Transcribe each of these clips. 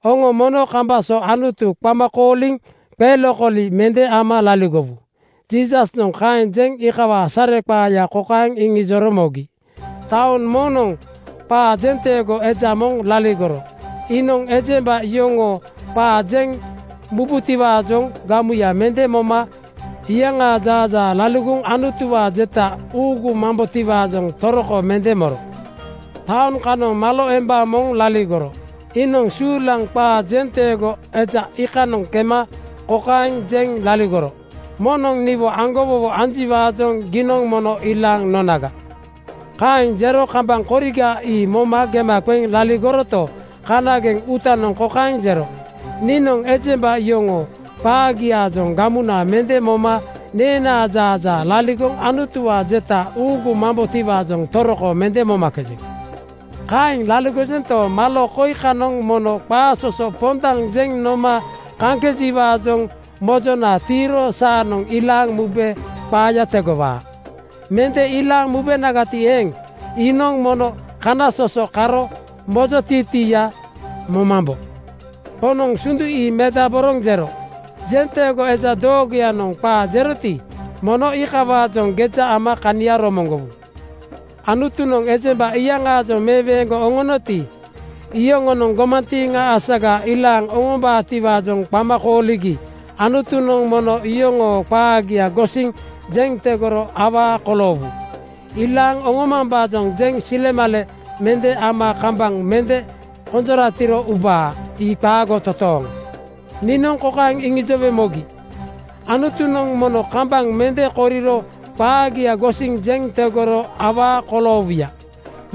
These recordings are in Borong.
“Oŋo mono kambaŋ so Anutu qama kooliŋ qelokoli mende ama laligowu.” Jiisasnoŋ kaeŋ jeŋ iikawaa sareqaaya kokaeŋ iŋijoro mogi, “Taoŋ moŋnoŋ qaa jenteego eja moŋ laligoro. Iinoŋ ejemba yoŋonoŋ qaa jeŋ mubutiwaajoŋ gamuya mende moma iyaŋaa jaajaa laligoŋ Anutuwaa jeta uugumambotiwaajoŋ toroko mende moro. Taoŋ kanoŋ malo emba moŋ laligoro. Iinoŋ suulaŋ qaa jenteego eja iikanoŋ kema kokaeŋ jeŋ laligoro, ‘Moŋnoŋ niwo aŋgowowo anjiwaajoŋ giinoŋ mono ilaaŋ nonaga.’ “Kaeŋ jero kambaŋ koriga ii moma gema qeŋ laligoroto, kanageŋ uutanoŋ kokaeŋ jero, ‘Niinoŋ ejemba yoŋoo qaagiaajoŋ gamuna mende moma neenaa jaajaa laligoŋ Anutuwaa jeta uugumambotiwaajoŋ toroko mende momakejeŋ. Kaeŋ laligojento, malo koi kanoŋ mono qaasoso pondaŋ jeŋ noma kaŋkejiwaajoŋ mojona tiiro saanoŋ ilaaŋ mube qaaya tegowaa. Mende ilaaŋ mubenagati eeŋ, iinoŋ mono kanasoso karo mojotiitiiya momambo.’” Poŋnoŋ sundu ii medaboroŋ jero, “Jenteego eja doogoyanoŋ qaa jeroti, mono iikawaajoŋ geja ama kania romoŋgowu. Anutunoŋ ejemba iyaŋaajoŋ meweeŋgoŋ oŋonoti, iyoŋonoŋ gomantiiŋa asasaga ilaaŋ oŋombaatiwaajoŋ qama kooligi Anutunoŋ mono yoŋoo qaagia gosiŋ jeŋ tegoro awaa koloowu. Ilaaŋ oŋomambaajoŋ jeŋ silemale mende ama kambaŋ mende konjoratiro ubaa. Ii qaago totooŋ! Niinoŋ kokaeŋ iŋijowe mogi: Anutunoŋ mono kambaŋ mende koriro qaagia gosiŋ jeŋ tegoro awaa koloowuya.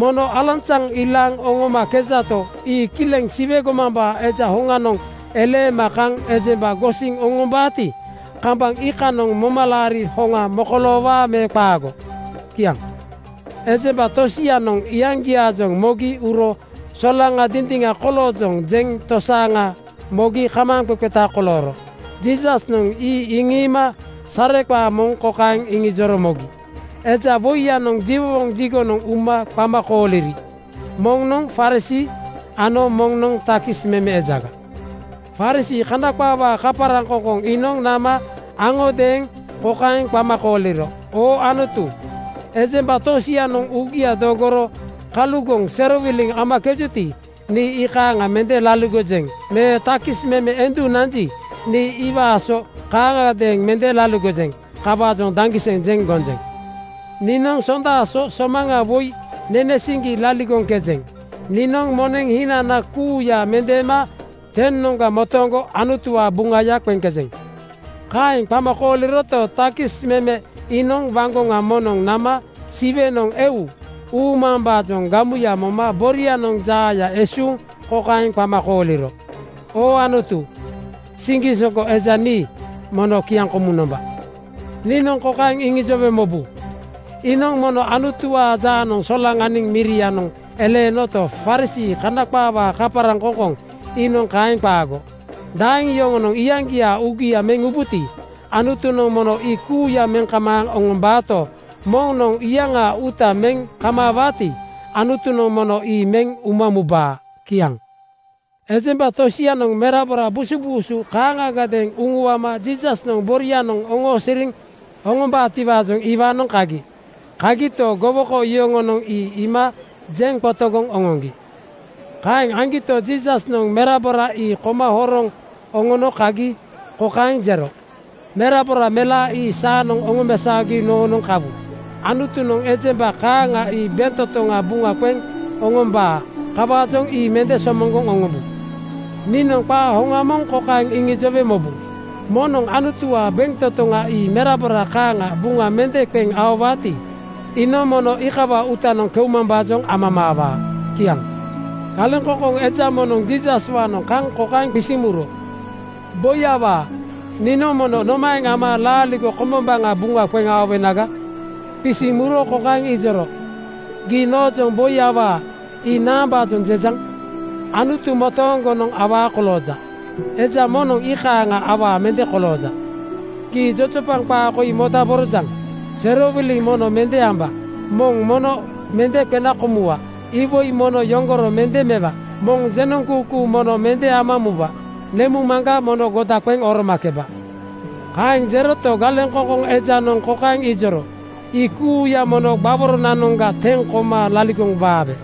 Mono alanzaŋ ilaaŋ oŋomakejato, ii kileŋ Siwe gomambaa Eja hoŋanoŋ eleema kaŋ ejemba gosiŋ oŋombaati, kambaŋ iikanoŋ momalaari hoŋa mokoloowaa me qaago?” Kiaŋ. Ejemba tosianoŋ iyaŋgiaajoŋ mogi uro solaŋa dindiŋa koloojoŋ jeŋ tosaaŋa mogi kamaaŋqeqeta kolooro. Jiisasnoŋ ii iŋiima sareqaa moŋ kokaeŋ iŋijoro mogi, “Eja woiyanoŋ jiwowoŋ jigonoŋ uma qama kooliri. Moŋnoŋ Farisii ano moŋnoŋ takis meme ejaga. “Farisii (Kana qaawaa kaparaŋkoŋkoŋ) iinoŋ nama aŋodeeŋ kokaeŋ qama kooliro, ‘Oo Anutu, ejemba tosianoŋ uugia dogoro kalugoŋ serowiliŋ amakejuti, nii ii kaaŋa mende laligojeŋ me takis meme endu nanji, nii iwaa so kaaŋagadeeŋ mende laligojeŋ. Kawaajoŋ daŋgiseŋ jeŋ gonjeŋ. Niinoŋ sonda so somaŋa woi nenewaa siŋgi laligoŋkejeŋ. Niinoŋ moneŋ hinana kuuya mendeema 10:noŋga motooŋgo Anutuwaa buŋaya qeŋkejeŋ.’ “Kaeŋ qama kooliroto, takis meme iinoŋ waŋgoŋa moŋnoŋ nama Siwenoŋ eu uumambaajoŋ gamuya moma borianoŋ jaaya esuuŋ kokaeŋ qama kooliro, ‘Oo Anutu, siŋgisoŋgo eja nii mono kiaŋkomuŋ nomba.’ Niinoŋ kokaeŋ iŋijowe mobu: Iinoŋ mono Anutuwaa jaanoŋ solaŋaniŋ mirianoŋ eleenoto, Farisii (Kana qaawaa kaparaŋkoŋkoŋ) iinoŋ kaeŋ qaago. Daeŋ yoŋonoŋ iyaŋgiaa uugia meŋ ubuti, Anutunoŋ mono ii kuuya meŋ kamaaŋ oŋombaato, moŋnoŋ iyaŋaa uuta meŋ kamaawaati, Anutunoŋ mono ii meŋ uma mubaa.” Kiaŋ. Ejemba tosianoŋ merabora busubuusu kaaŋagadeeŋ uŋuama Jiisasnoŋ borianoŋ oosiriŋ oŋombaatiwaajoŋ iwaanoŋ kagi. Kagito, gowoko yoŋonoŋ ii iima jeŋ qotogoŋ oŋoŋgi. Kaeŋ aŋgito, Jiisasnoŋ merabora ii koma horoŋ oŋono kagi kokaeŋ jero, “Merabora melaa ii saanoŋ oŋomesaogi noonoŋ kawu. Anutunoŋ ejemba kaaŋa ii bentotoŋa buŋa qeŋ oŋombaa. Kawaajoŋ ii mende somoŋgoŋ oŋombu. Niinoŋ qaa hoŋa moŋ kokaeŋ iŋijowe mobu: Moŋnoŋ Anutuwaa bentotoŋa ii merabora kaaŋa buŋa mende qeŋ aowaati, iinoŋ mono iikawaa uutanoŋ keumambaajoŋ amamaawaa.” Kiaŋ. Galeŋkoŋkoŋ eja moŋnoŋ Jiisaswaanoŋ kaŋ kokaeŋ qisiŋ muro, “Boi awaa, niinoŋ mono nomaeŋ ama laaligo kombombaŋa buŋa qeŋ aowenaga?” Qisiŋ muro kokaeŋ ijoro, “Gii noojoŋ ‘Boi awaa’, ii naambaajoŋ jejaŋ? Anutu motooŋgonoŋ awaa kolooja. Eja moŋnoŋ ii kaaŋa awaa mende kolooja. Gii jojopaŋ qaa koi modaborojaŋ: ‘Serowiliŋ mono mende amba. Moŋ mono mende qena komuwa. Iwoi mono yoŋgoro mende mewa. Moŋ jenoŋkuukuu mono mende ama muba. Nemuŋmaŋga mono goda qeŋ oromakeba.’” Kaeŋ jeroto, galeŋkoŋkoŋ ejanoŋ kokaeŋ ijoro, “Ii kuuya mono gbaworonanoŋga teŋ koma laligoŋ waabe.”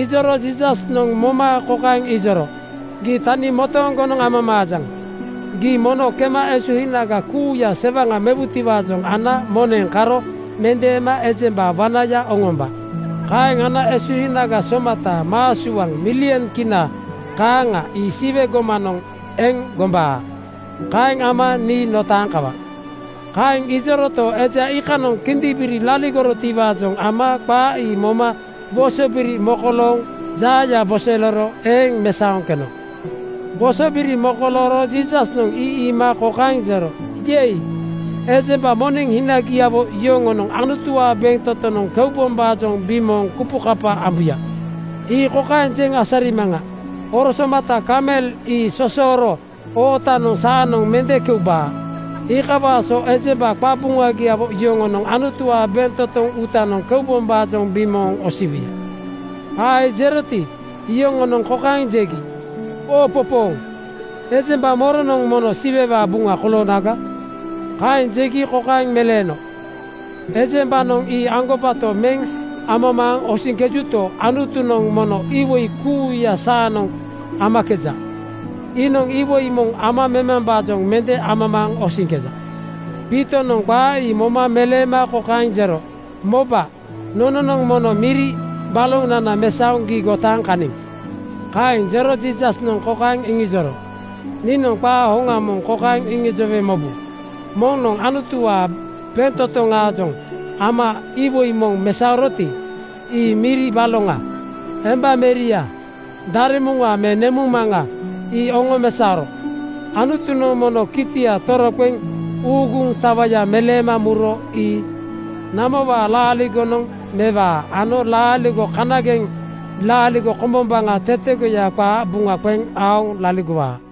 Ijoro Jiisasnoŋ moma kokaeŋ ijoro, “Gii tani motooŋgonoŋ amamaajaŋ: Gii mono kema esuhinaga kuuya sewaŋa mewutiwaajoŋ ana moneŋ karo mendeema ejemba wanaya oŋomba. Kaeŋ ana esuhinaga somata (maa suaŋ, milyon kina kaaŋa) ii Siwe gomanoŋ eŋ gombaa. Kaeŋ ama nii notaaŋ kawa.” Kaeŋ ijoroto, eja iikanoŋ kindimbiri laligorotiwaajoŋ ama qaa ii moma wosobiri mokolooŋ jaaya bosoleero eeŋ mesaoŋ keno. Wosobiri mokolooro Jiisasnoŋ ii iima kokaeŋ jero, “Yei! Ejemba moneŋ hinagiawo yoŋonoŋ Anutuwaa bentotonoŋ keubombaajoŋ bimooŋ kupukapa ambuya. Ii kokaeŋ jeŋ asarimaŋa: Oro somata kamel ii sosoro ootanoŋ saanoŋ mende keubaa. Iikawaa so ejemba qabuŋagiawo yoŋonoŋ Anutuwaa bentotoŋ uutanoŋ keubombaajoŋ bimooŋ osiwuya.” Qaa ii jeroti, iyoŋonoŋ kokaeŋ jegi, “Oopopooŋ! Ejemba moronoŋ mono Siwewaa buŋa koloonaga?” Kaeŋ jegi kokaeŋ meleeno, “Ejembanoŋ ii aŋgobato meŋ amamaaŋ osiŋkejuto, Anutunoŋ mono iwoi kuuya saanoŋ amakeja. Iinoŋ iwoi moŋ ama memambaajoŋ mende amamaaŋ osiŋkeja.” Piitonoŋ qaa ii moma meleema kokaeŋ jero, “Moba, nononoŋ mono miri balonana mesaoŋ gii gotaaŋ kaniŋ.” Kaeŋ jero Jiisasnoŋ kokaeŋ iŋijoro, “Niinoŋ qaa hoŋa moŋ kokaeŋ iŋijowe mobu: Moŋnoŋ Anutuwaa bentotoŋaajoŋ ama iwoi moŋ mesaoroti, —ii miri baloŋa, embameria, daremuŋa me nemuŋmaŋa —ii oŋomesaoro Anutunoŋ mono kitia toroqeŋ uuguŋ tawaya meleema muro ii namowaa laaligonoŋ mewaa ano laaligo kanageŋanoŋ laaligo kombombaŋa tetegoya qaa buŋa qeŋ aoŋ laligowaa.”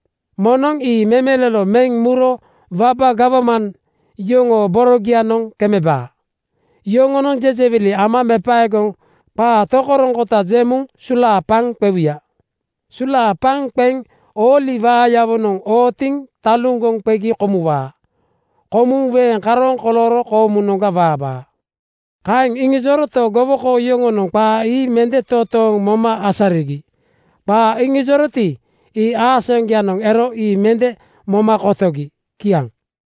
Moŋnoŋ ii memelolo meŋ muro waba gawman yoŋoo borogianoŋ kemebaa. Yoŋonoŋ jejewili ama mepaegoŋ qaa tokoroŋkota jeŋ muŋ sulaapaŋ qewuya. Sulaapaŋ qeŋ ooli waayawonoŋ ootiŋ taluŋgoŋ qegi komuwaa. Komuŋ weeŋ karooŋ kolooro koomunoŋga waabaa.” Kaeŋ iŋijoroto, gowoko yoŋonoŋ qaa ii mende totooŋ moma asarigi. Qaa iŋijoroti, ii aasaŋgoyanoŋ ero ii mende moma kotogi. Kiaŋ.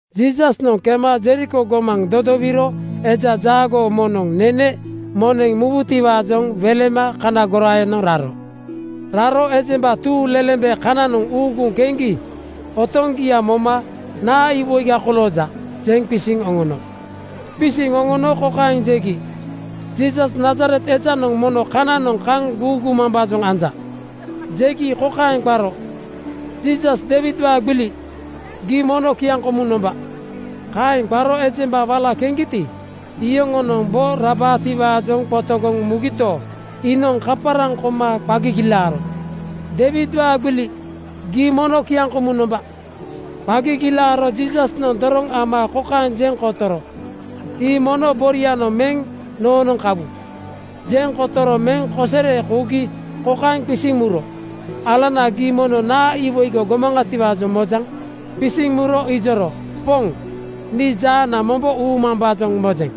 Jiisasnoŋ kema Jeriko gomaŋ dodowiro eja jaagoo moŋnoŋ nene moneŋ mubutiwaajoŋ welema kana goraayanoŋ raro. Raro ejemba tuuŋlelembe kananoŋ uuguŋ keŋgi otoŋgia moma “Naa iwoi kolooja?” jeŋ qisiŋ oŋono. Qisiŋ oŋono kokaeŋ jegi, “Jiisas, Nazaret ejanoŋ mono kananoŋ kaŋ guugumambaajoŋ anja.” Jegi kokaeŋ qaro, “Jiisas, Deiwidwaa gbili! Gii mono kiaŋkomuŋ nomba!” Kaeŋ qaro ejemba wala keŋgiti, iyoŋonoŋ bo rabaatiwaajoŋ qotogoŋ mugito, iinoŋ kaparaŋ koma qa gigilaaro, “Deiwidwaa gbili! Gii mono kiaŋkomuŋ nomba!” Qa gigilaaro Jiisasnoŋ doroŋ ama kokaeŋ jeŋ kotoro, “Ii mono borianoŋ meŋ noonoŋ kawu.” Jeŋ kotoro meŋ kosere kougi kokaeŋ qisiŋ muro, “Alana, gii mono naa iwoi gomaŋatiwaajoŋ mojaŋ?” Qisiŋ muro ijoro, “Poŋ! Nii jaana mombo uumambaajoŋ mojeŋ.”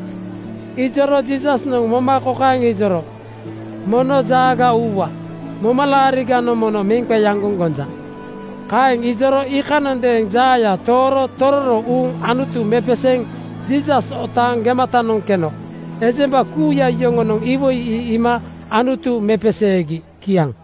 Ijoro Jiisasnoŋ moma kokaeŋ ijoro, “Mono jaaga uuwa. Momalaariganoŋ mono meŋ qeaŋgoŋ gonja.” Kaeŋ ijoro iikanondeeŋ jaaya tooro tororo uuŋ Anutu mepeseeŋ Jiisas otaaŋ gematanoŋ keno. Ejemba kuuya yoŋonoŋ iwoi ii iima Anutu mepeseegi. Kiaŋ.